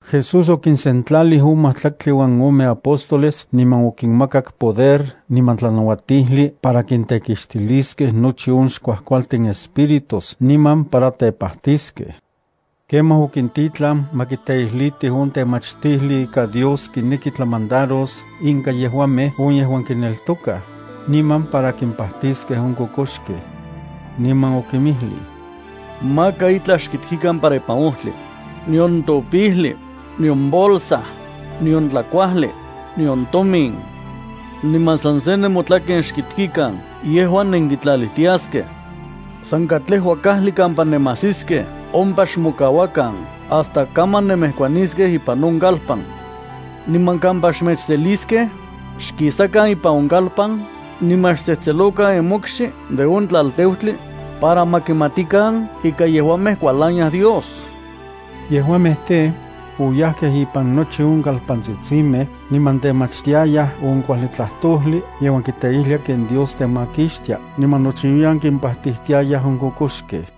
Jesús okinsentlalij on majtlaktli uan ome apóstoles niman okinmakak poder niman tlanauatijli para kintekixtiliskej nochi on xkuajkualtin espíritus niman para tepajtiskej. Kemaj okintitlan ma kiteijlitij on temachtijli ika Dios kineki tlamandaros inka yejuamej on yejuan kineltokaj, niman para kimpajtiskej on kokoxkej. Niman okinmijlij: —Maka itlaj xkiktikan para ipan ojtli, nion topijli, nion bolsa, nion tlakuajli, nion tomin. Niman san se nemotlaken yejuan nekitlalijtiaskej. San katlejua kajli kampa nemajsiskej ompa xmokauakan hasta kaman nenmejkuaniskej ipan on kalpan. Niman kampa xmechseliskej, xkisakan ipan on kalpan niman xtsejtselokan nemokxi de on tlalteutli, para ma kimatikan ika yejuamej kualaniaj Dios. Yejuamej tej, oyajkej ipan nochi on kalpantsitsimej, niman temachtiayaj on kuajli tlajtojli yejuan kiteijlia ken Dios temakixtia niman nochiuiyan kimpajtijtiayaj on kokoxkej.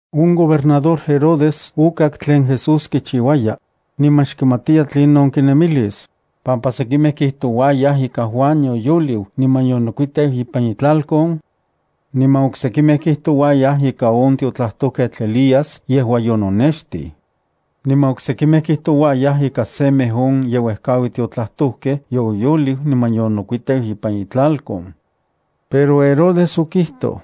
On gobernador Herodes okak tlen Jesús kichiuaya, niman xkimatiya tlinon kinemilis, pampa sekimej kijtouayaj ika Juan yoyoliu niman yonokuiteu ipan itlalkon, niman oksekimej kijtouayaj ika on tiotlajtojketl Elías yejua yononextij. Niman oksekimej kijtouayaj ika semej on ye uejkaui tiotlajtojkej yoyoliu niman yonokuiteu ipan itlalkon. Pero Herodes okijtoj: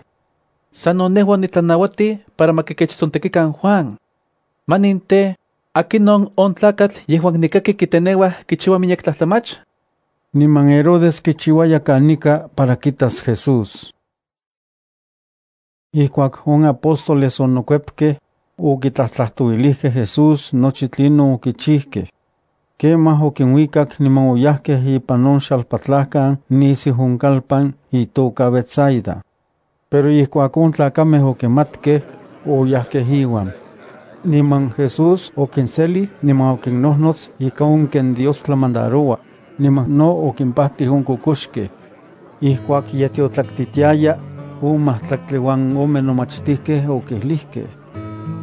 —Sano nejua onitlanauatij para ma kikechtsontekikan Juan. ¿Manin tej, akinon on tlakatl yejuan nikaki kiteneuaj kichiua miyek tlajtlamach? Niman Herodes kichiuaya kanika para kitas Jesús. Ijkuak on apóstoles onokuepkej, okitlajtlajtouilijkej Jesús nochi tlinon okichijkej. Kemaj okinuikak niman oyajkej ipan on xalpatlajkan nisiu on kalpan, itoka Betsaida. Pero ijkuak on tlakamej okimatkej, oyajkej iuan. Niman Jesús okinselij niman okinnojnots ika on ken Dios tlamandaroua, niman Jesús no okimpajtij on kokoxkej. Ijkuak ye tiotlaktitiaya, on majtlaktli uan ome nomachtijkej okijlijkej: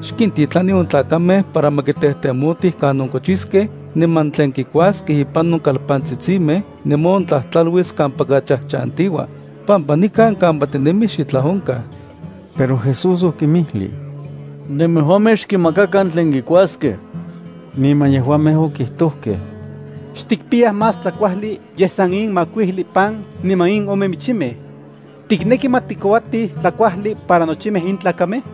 —Xkintijtitlani on tlakamej para ma kitejtemotij kanon kochiskej niman tlen kikuaskej ipan on kalpantsitsimej niman ontlajtlaluis kampaka chajchantiua, pampa nikan kampa tinemij xitlaj onkaj. Pero Jesús okinmijlij: —Nemejuamej xkinmakakan tlen kikuaskej. Niman yejuamej okijtojkej: —Xtikpiyaj más tlakuajli yej san in makuijli pan niman in ome michimej. ¿Tikneki ma tikouatij tlakuajli para nochimej in tlakamej?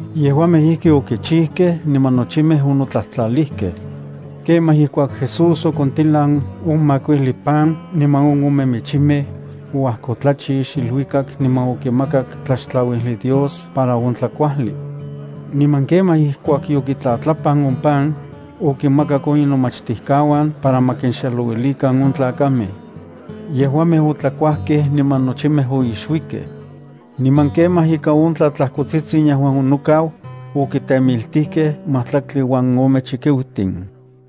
Yejuamej ijki okichijkej niman nochimej onotlajtlalijkej. Kemaj ijkuak Jesús okontilan on makuijli pan niman on ome michimej, oajkotlachix iluikak niman okimakak tlaxtlauijli Dios para on tlakuajli. Niman kemaj ijkuak yokitlatlapan on pan, okinmakak on inomachtijkauan para ma kinxexelouilikan on tlakamej. Yejuamej otlakuajkej niman nochimej oixuikej. Niman kemaj ika on tlatlajkotsitsin yejuan onokau, okitemiltijkej majtlaktli uan ome chikiutin.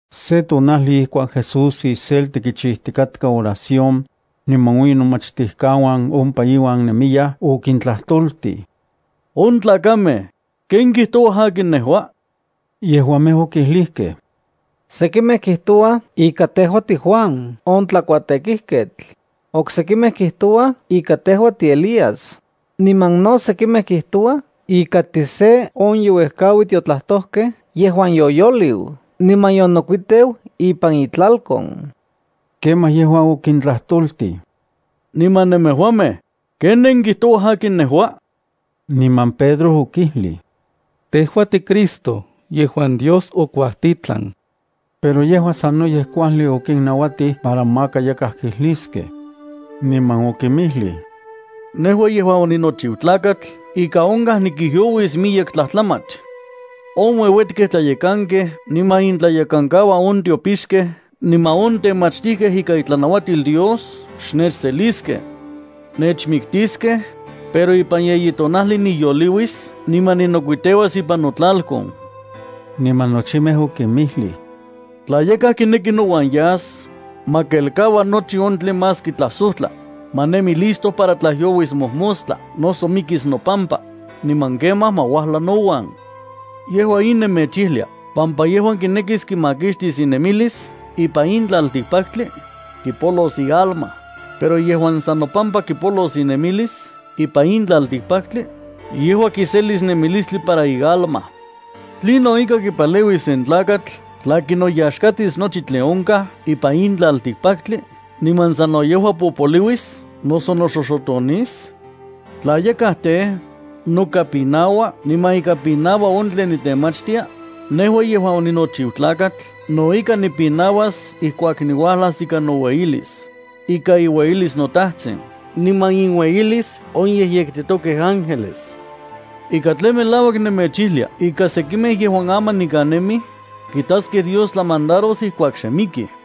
Se tonajli ijkuak Jesús iselti kichijtikatka oración, niman on inomachtijkauan ompa iuan nemiyaj, okintlajtoltij: —On tlakamej, ¿ken kijtouaj akin nejua? Yejuamej okijlijkej: —Sekimej kijtouaj ika tejua tiJuan on tlakuatekijketl, oksekimej kjtouaj ika tejua tiElías, niman no sekimej kijtouaj ika tise on ye uejkaui tiotlajtojkej yejuan yoyoliu niman yonokuiteu ipan itlalkon. Kemaj yejua okintlajtoltij: —Niman nemejuamej, ¿ken nenkijtouaj akin nejua? Niman Pedro okijlij: —Tejua tiCristo yejuan Dios okuatitlan. Pero yejua sanoyej kuajli okinnauatij para maka yakaj kijliskej. Niman okinmijlij: —Nejua yejuan oninochiu Tlakatl ika onkaj nikijyouis miyek tlajtlamach. On ueuetkej tlayekankej niman intlayekankauan on tiopixkej niman on temachtijkej ikan itlanauatil Dios xnechseliskej. Nechmiktiskej, pero ipan yeyi tonajli niyoliuis niman ninokuiteuas ipan notlalkon. Niman nochimej okinmijlij: —Tla yakaj kineki nouan yas, ma kelkaua nochi on tlen más kintlasojtla, ma nemi listo para tlajyouis mojmostla noso mikis nopampa, niman kemaj ma uajla nouan. Yejua in nemechijlia pampa yejuan kinekis kimakixtis inemilis ipan in tlaltikpaktli, kipolos ialma, pero yejuan san nopampa kipolos inemilis ipan in tlaltikpaktli, yejua kiselis nemilistli para ialma. ¿Tlinon ika kipaleuis sen tlakatl tla kinoyaxkatis nochi tlen onkaj ipan in tlaltikpaktli niman sano yejua popoliuis noso noxoxotonis? Tla yakaj tej, noka pinaua niman ika pinaua on tlen niktemachtia, nejua yejuan oninochiu Tlakatl no ika nipinauas ijkuak niuajlas ikan noueyilis, ikan iueyilis noTajtsin niman inueyilis on yejyektitokej ángeles. Ika tlen melauak nemechijlia ika sekimej yejuan aman nikan nemij kitaskej Dios tlamandaros ijkuak xe mikij.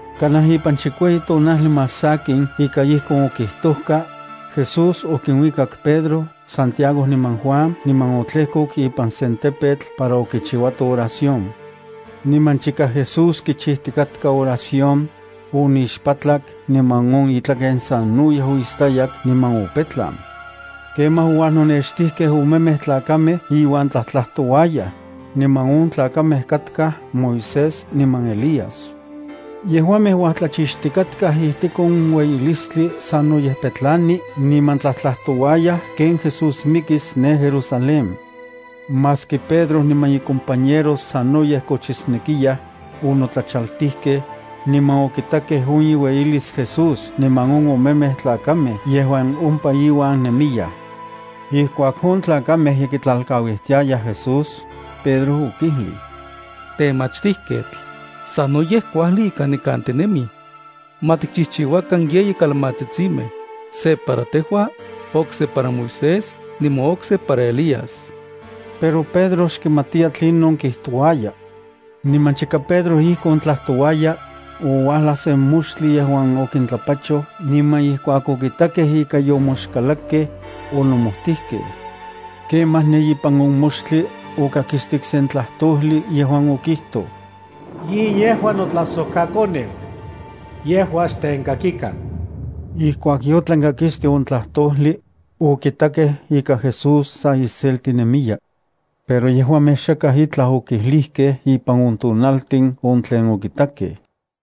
Kanaj ipan chikueyi tonajli más sakin ika ijkon okijtojka, Jesús okinuikak Pedro, Santiago niman Juan niman otlejkok ipan sen tepetl para okichiuato oración. Niman chika Jesús kichijtikatka oración, onixpatlak niman on itlaken sanoyej oistayak niman opetlan. Kemaj ouajnonextijkej omemej tlakamej iuan tlajtlajtouayaj, niman on tlakamej katkaj Moisés niman Elías. Yejuamej uatlachixtikatkaj ijtik on ueyilistli sanoyej petlani niman tlajtlajtouayaj ken Jesús mikis ne Jerusalén. Maski Pedro niman icompañeros sanoyej kochisnekiyaj, onotlachaltijkej, niman okitakej on iueyilis Jesús niman on omemej tlakamej yejuan ompa iuan nemiyaj. Ijkuak on tlakamej ye kitlalkauijtiayaj Jesús, Pedro okijlij: —Temachtijketl, ¡sanoyej kuajli ika nikan tinemij! Ma tikchijchiuakan yeyi kalmatsitsintin: se para tejua, okse para Moisés niman okse para Elías. Pero Pedro xkimatiya tlinon kijtouaya. Niman chika Pedro ijkon tlajtouaya, ouajlaj sen moxtli yejuan okintlapachoj niman ijkuak okitakej ika yomoxkalakkej, onomojtijkej. Kemaj ne ipan moxtli okakistik sen tlajtojli yejuan okijtoj: —In yejua notlajsojkaKoneu. Yejua xtenkakikan. Ijkuak yotlan kakisti on tlajtojli, okitakej ika Jesús sa iselti nemiya. Yejuamej xok onauatkej niman xakaj itlaj okijlijkej ipan on tonaltin on tlen okitakej.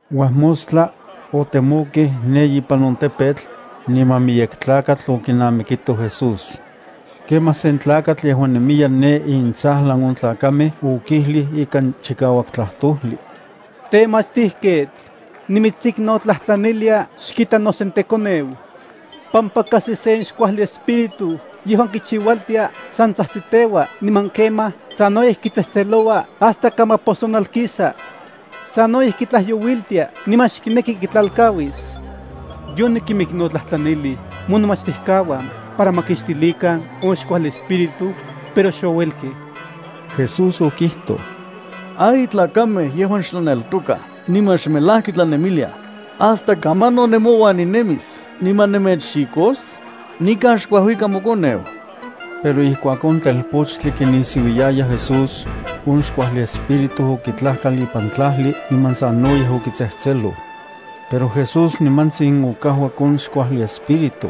Uajmostla, otemokej ne ipan on tepetl, niman miyek tlakatl okinamikito Jesús. Kemaj sen tlakatl yejuan nemiya ne intsajlan on tlakamej okijlij ikan chikauak tlajtojli: —Temachtijketl, nimitsiknotlajtlanilia xkita nosentekoneu, pampa kajsi sen xkuajli espíritu yejuan kichiualtia san tsajtsiteua niman kemaj sanoyej kitsejtseloua hasta kamaposonalkisa. Sanoyej kitlajyouiltia niman xkineki kitlalkauis. Yonikinmiknotlajtlanilij monomachtijkauan para ma kixtilikan on xkuajli espíritu, pero xouelkej. Jesús okijtoj: —¡Ay tlakamej yejuan xtlaneltoka niman xmelajki tlanemiliaj! ¿Hasta kamanon nemouan ninemis niman nemechxikos? Nikan xkuajuika mokoneu. Pero ijkuak on telpochtli kinisiuiaya Jesús, on xkuajli espíritu okitlajkal ipan tlajli niman sanoyej okitsejtseloj. Pero Jesús nimantsin okajuak on xkuajli espíritu,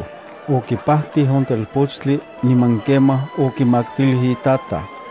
okipajtij on telpochtli niman kemaj okimaktilij itataj.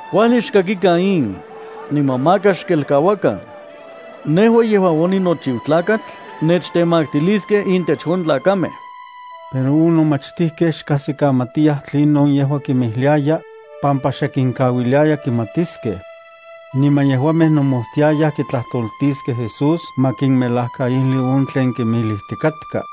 —Kuajli xkakikan in, niman maka xkelkauakan. Nejua yejuan oninochiu Tlakatl nechtemaktiliskej intech on tlakamej. Pero on nomachtijkej xkajsikamatiyaj tlinon yejua kinmijliaya, pampa xe kinkauiliaya kimatiskej. Niman yejuamej nomojtiayaj kitlajtoltiskej Jesús ma kinmelajkaijli on tlen kimijlijtikatka.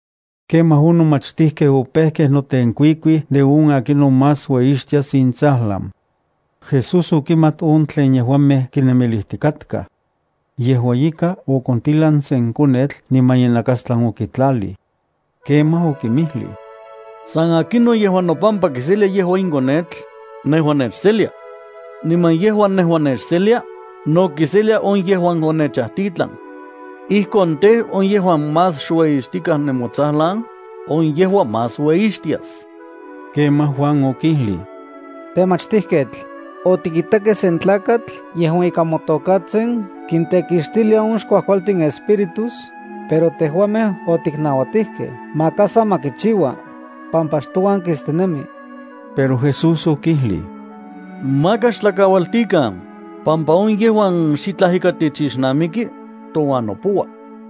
Kemaj on nomachtijkej opejkej notenkuikuij de on akinon más ueyixtias intsajlan. Jesús okimat on tlen yejuamej kinemilijtikatkaj. Yejua ika, okontilan sen konetl niman inakastlan okitlalij. Kemaj okinmijlij: —San akinon yejuan nopampa kiselia yejua in konetl, nejua nechselia. Niman yejuan nejua nechselia, no kiselia on yejuan onechajtitlan. Ijkon tej, on yejuan más xueixtikaj nemotsajlan, on yejua más ueyixtias. Kemaj Juan okijlij: —Temachtijketl, otikitakej sen tlakatl yejuan ikan motokatsin kintekixtilia on xkuajkualtin espíritus, pero tejuamej otiknauatijkej maka sa ma kichiua, pampa xtouan kistinemi. Pero Jesús okijlij: —Maka xtlakaualtikan, pampa on yejuan xitlaj ika techixnamiki, touan nopoua.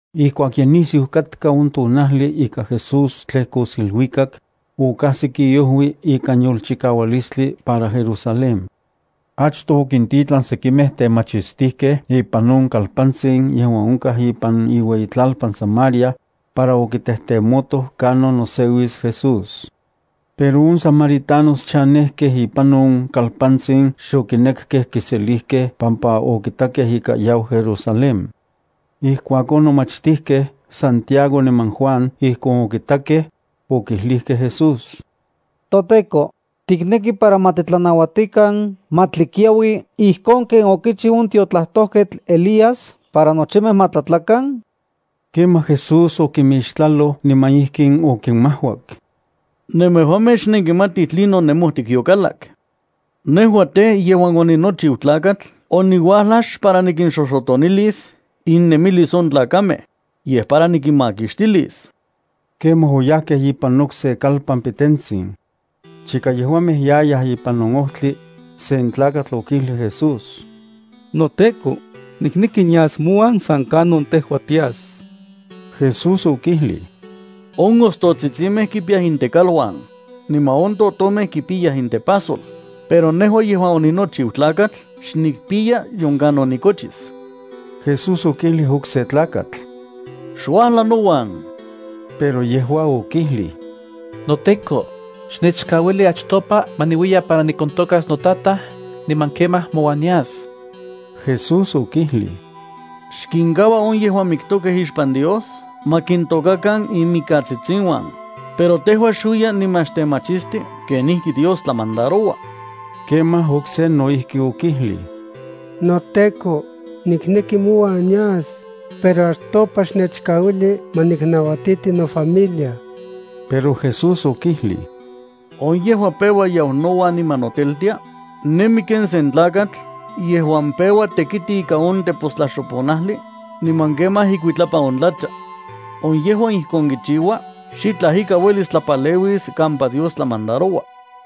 Ijkuak ye nisiu katka on tonajli ika Jesús tlejkos iluikak, okajsik iojui ikan yolchikaualistli para Jerusalén. Achtoj okintitlan sekimej temachistijkej ipan on kalpantsin yejuan onkaj ipan iueyitlalpan Samaria, para okitejtemotoj kanon noseuis Jesús. Pero on samaritanos chanejkej ipan on kalpantsin xokinekkej kiselijkej pampa okitakej ika yau Jerusalén. Ijkuak on nomachtijkej Santiago niman Juan ijkon okitakej, okijlijkej Jesús: —ToTEKO, ¿tikneki para ma titlanauatikan ma tlikiaui ijkon ken okichiu on tiotlajtojketl Elías para nochimej ma tlatlakan? Kemaj Jesús okimixtlaloj niman ijkin okimajuak: —Nemejuamej xnenkimatij tlinon nemojtik yokalak. Nejua tej, yejuan oninochiu Tlakatl oniuajlaj xpara nikinxoxotonilis innemilis on tlakamej, yej para nikinmakixtilis. Kemaj oyajkej ipan okse kalpan pitentsin. Chika yejuamej yayaj ipan on ojtli, sen tlakatl okijlij Jesús: —NoTEKO, nikneki nias mouan san kanon tejua tias. Jesús okijlij: —On ostotsitsimej kipiyaj intekaluan, niman on totomej kipiyaj intepajsol, pero nejua yejuan oninochiu Tlakatl xnikpiya nion kanon nikochis. Jesús okijlij okse tlakatl: —Xuajla nouan. Pero yejua okijlij: —NoTEKO, xnechkauili achtopa ma niuiya para nikontôkas notataj niman kemaj mouan nias. Jesús okijlij: —Xkinkaua on yejuan miktokej ixpan Dios ma kintokakan inmikatsitsiuan, pero tejua xuiya niman xtemachisti kenijki Dios tlamandaroua. Kemaj okse no ijki okijlij: —NoTEKO, nikneki mouan nias, pero achtopa xnechkauili ma nikinnauatiti nofamilia. Pero Jesús okijlij: —On yejuan peua yau nouan niman noteltia, nemi ken sen tlakatl yejuan peua tekiti ika on tepostlaxoponajli, niman kemaj ikuitlapan on tlacha. On yejuan ijkon kichiua xitlaj ika uelis tlapaleuis kampa Dios tlamandaroua.